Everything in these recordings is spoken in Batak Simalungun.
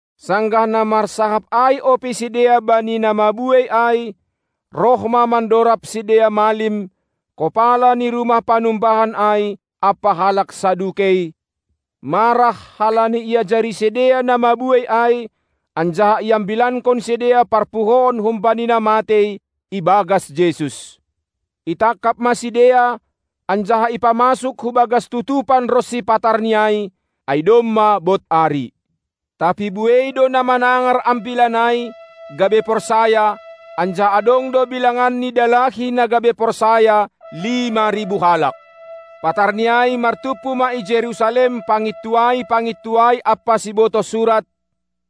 Sanggah na marsahap ai ope sidea bani na mabuei ai, roh ma mandorab sidea malim, kopala ni rumah panumbahan ai ampa halak Sadukei, marah halani iajari sidea na mabuei ai, anjaha iambilankon sidea parpuhoon humbani na matei ibagas Jesus. Itangkap ma sidea, anjaha ipamasuk hubagas tutupan ronsi patar ni ai, ai domma bod ari. Tapi buei do na manangar ambilan ai, gabe porsaya, anjaha adong do bilangan ni dalahi na gabe porsaya lima ribu halak. Patarni ai martumpu ma i Jerusalem pangintuai-pangintuai ampa sibotoh surat,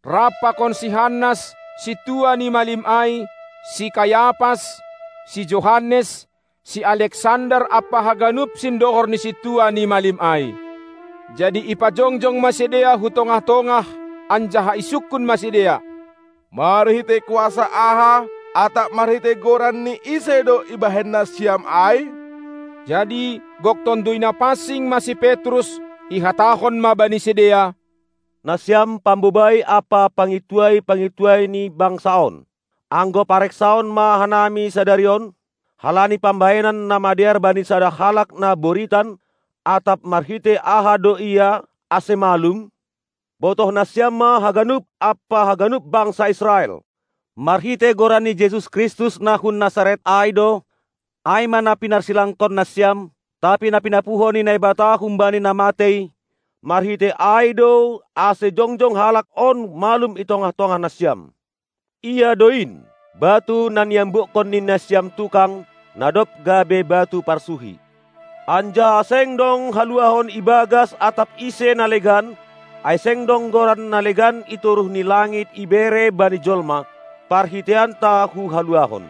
rap pakon si Hannas, sintua ni malim ai, si Kayapas, si Johannes, si Aleksander ampa haganup sindohor ni sintua ni malim ai. Jadi ipajongjong ma sidea hu tongah-tongah anjaha isungkun ma sidea: Marhitei kuasa aha atap marhitei goran ni ise do ibahen nasiam ai? Jadi gok Tonduy Napansing ma si Petrus, ihatahon ma bani sidea: Nasiam pambobai ampa pangintuai-pangintuai ni bangsa on. Anggo pareksaon ma hanami sadari on, halani pambahenan na madear bani sada halak na boritan, atap marhitei aha do ia, ase malum, botoh nasiam ma haganup ampa haganup bangsa Israel: Marhitei Goran ni Jesus Kristus na hun Nasaret ai do, ai ma na pinarsilangkon nasiam, tapi na pinapuho ni Naibata humbani na matei, marhitei ai do, ase jongjong halak on malum i tongah-tongah nasiam. Ia do in, batu na niambukkon ni nasiam tukang, na dob gabe batu parsuhi. Anjaha seng dong haluahon ibagas atap ise na legan, ai seng dong goran na legan i toruh ni langit ibere bani jolma, parhiteianta hu haluahon.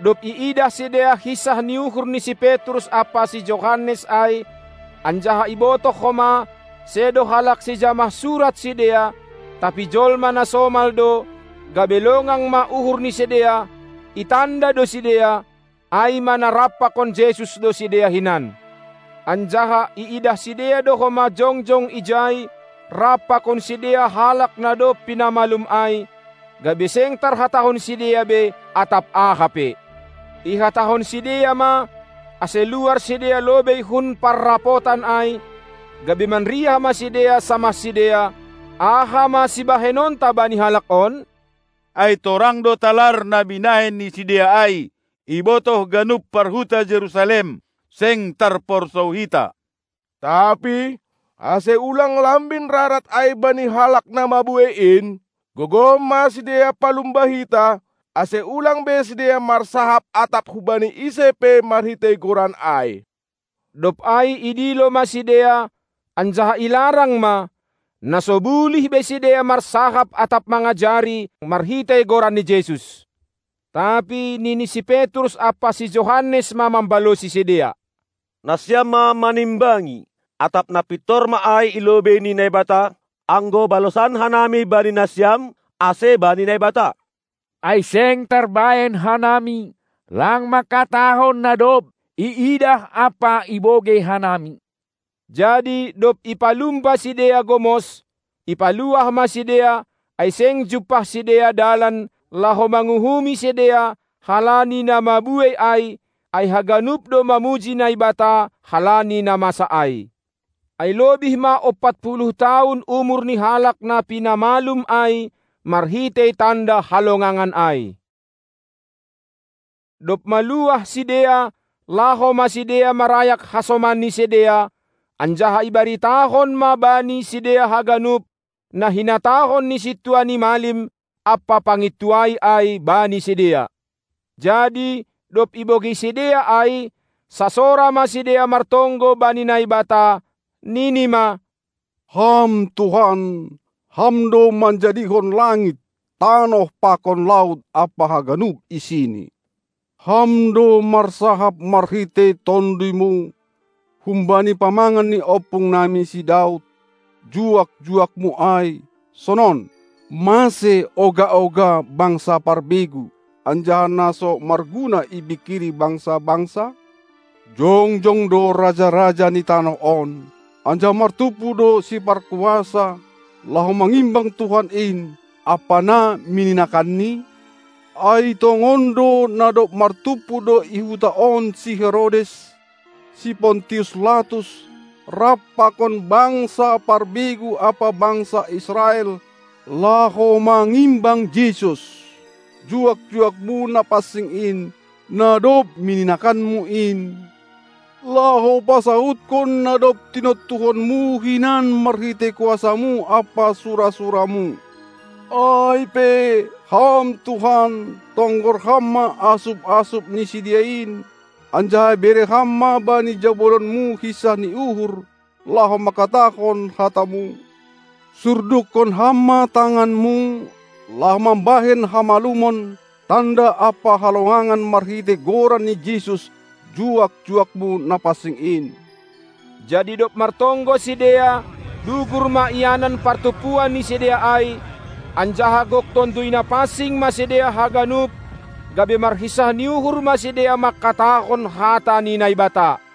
Dob iidah sidea hinsah ni uhur ni si Petrus ampa si Johannes ai, anjaha ibotoh homa, sedo halak sijamah surat sidea, tapi jolma na somal do, gabe longang ma uhur ni sidea; itanda do sidea, ai ma na rap pakon Jesus do sidea hinan. Anjaha iidah sidea do homa jongjong ijai rap pakon sidea halak na dob pinamalum ai, gabe seng tarhatahon sidea be atap aha pe. Ihatahon sidea ma, ase luar sidea lobei hun parrapotan ai, gabe manriah ma sidea samah sidea: Aha ma sibahenonta bani halak on? Ai torang do talar na binahen ni sidea ai, ibotoh ganup parhuta Jerusalem, seng tarporsou hita. Tapi, ase ulang lambin rarat ai bani halak na mabuei in, gogoh ma sidea palumba hita, ase ulang be sidea marsahap atap hubani ise pe marhitei goran ai. Dob ai idilo ma sidea, anjaha ilarang ma, na so bulih be sidea marsahap atap mangajari marhitei Goran ni Jesus. Tapi nini si Petrus ampa si Johannes ma mambalosi sidea: Nasiam ma manimbangi, atap na pintor ma ai i lobei ni Naibata, anggo balosan hanami bani nasiam ase bani Naibata. Ai seng tarbahen hanami lang mangkatahon na dob iidah ampa ibogei hanami. Jadi dob ipalumba sidea gomos, ipaluah ma sidea, ai seng jumpah sidea dalan, laho manguhumi sidea halani na mabuei ai, ai haganup do mamuji Naibata halani na masa ai. Ai lobih ma ompat puluh tahun umur ni halak na pinamalum ai marhitei tanda halongangan ai. Dob maluah sidea, laho ma sidea marayak hasoman ni sidea, anjaha ibaritahon ma bani sidea haganup, na hinatahon ni sintua ni malim ampa pangintuai ai bani sidea. Jadi dob ibogei sidea ai, sasora ma sidea martonggo bani Naibata, nini ma: Ham Tuhan, Ham do manjadihon langit, tanoh pakon laut ampa haganup isini! Ham do marsahap marhitei Tonduymu, humbani pamangan ni ompung nami si Daud, juak-juak-Mu ai, sonon: Mase oga-oga bangsa parbegu, anjaha na so marguna ipingkiri bangsa-bangsa? Jongjong do raja-raja ni tanoh on, anjaha martumpu do siparkuasa, laho mangimbang Tuhan in, ampa na mininakanNi? Ai tongon do, na dob martumpu do i huta on si Herodes, si Pontius Latus, rap pakon bangsa parbegu ampa bangsa Israel, laho mangimbang Jesus, juak-juak-Mu Napansing in, na dob mininakan-Mu in, laho pasaudkon, na dob tinontuhon-Mu hinan marhitei kuasa-Mu ampa sura-sura-Mu. Ai pe, Ham Tuhan, tonggor Ham ma asup-asup ni sidea in, anjaha bere Ham ma bani jabolon-Mu hinsah ni uhur, laho mangkatahon hata-Mu! Surdukkon Ham ma tangan-Mu, laho mambahen hamalumon, tanda ampa halongangan marhitei Goran ni Jesus, juak-juak-Mu Napansing in! Jadi dob martonggo sidea, dugur ma ianan partumpuan ni sidea ai, anjaha gok Tonduy Napansing ma sidea haganup, gabe marhinsah ni uhur ma sidea mangkatahon hata ni Naibata.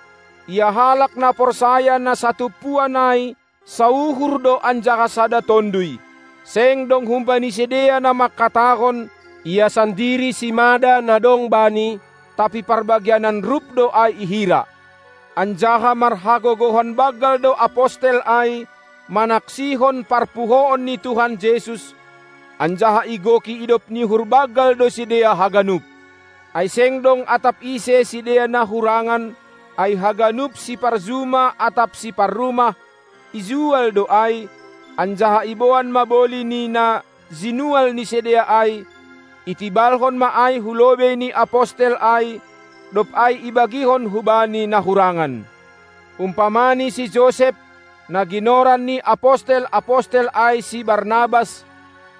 Ia halak na porsaya na satumpuan ai sauhur do anjaha sada tonduy. Seng dong humbani sidea na mangkatahon ia sandiri simada na dong bani, tapi parbagianan rup do ai ihira. Anjaha marhagogohon banggal do apostel ai manaksihon parpuhoon ni Tuhan Jesus, anjaha igoki idop ni uhur banggal do sidea haganup. Ai seng dong atap ise sidea na hurangan; ai haganup siparjuma atap siparrumah, ijual do ai, anjaha iboan ma boli ni na jinual ni sidea ai, itibalhon ma ai hu lobei ni apostel ai, dob ai ibagihon hubani na hurangan. Umpamani si Josep, na ginoran ni apostel-apostel ai si Barnabas,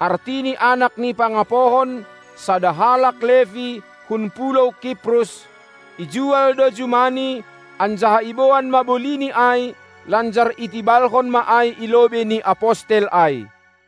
artini anak ni pangapohon, sada halak Lepi, hun pulou Kiprus, ijual do jumani, anjaha iboan ma bolini ai lanjar itibalhon ma i lobei ni apostel ai.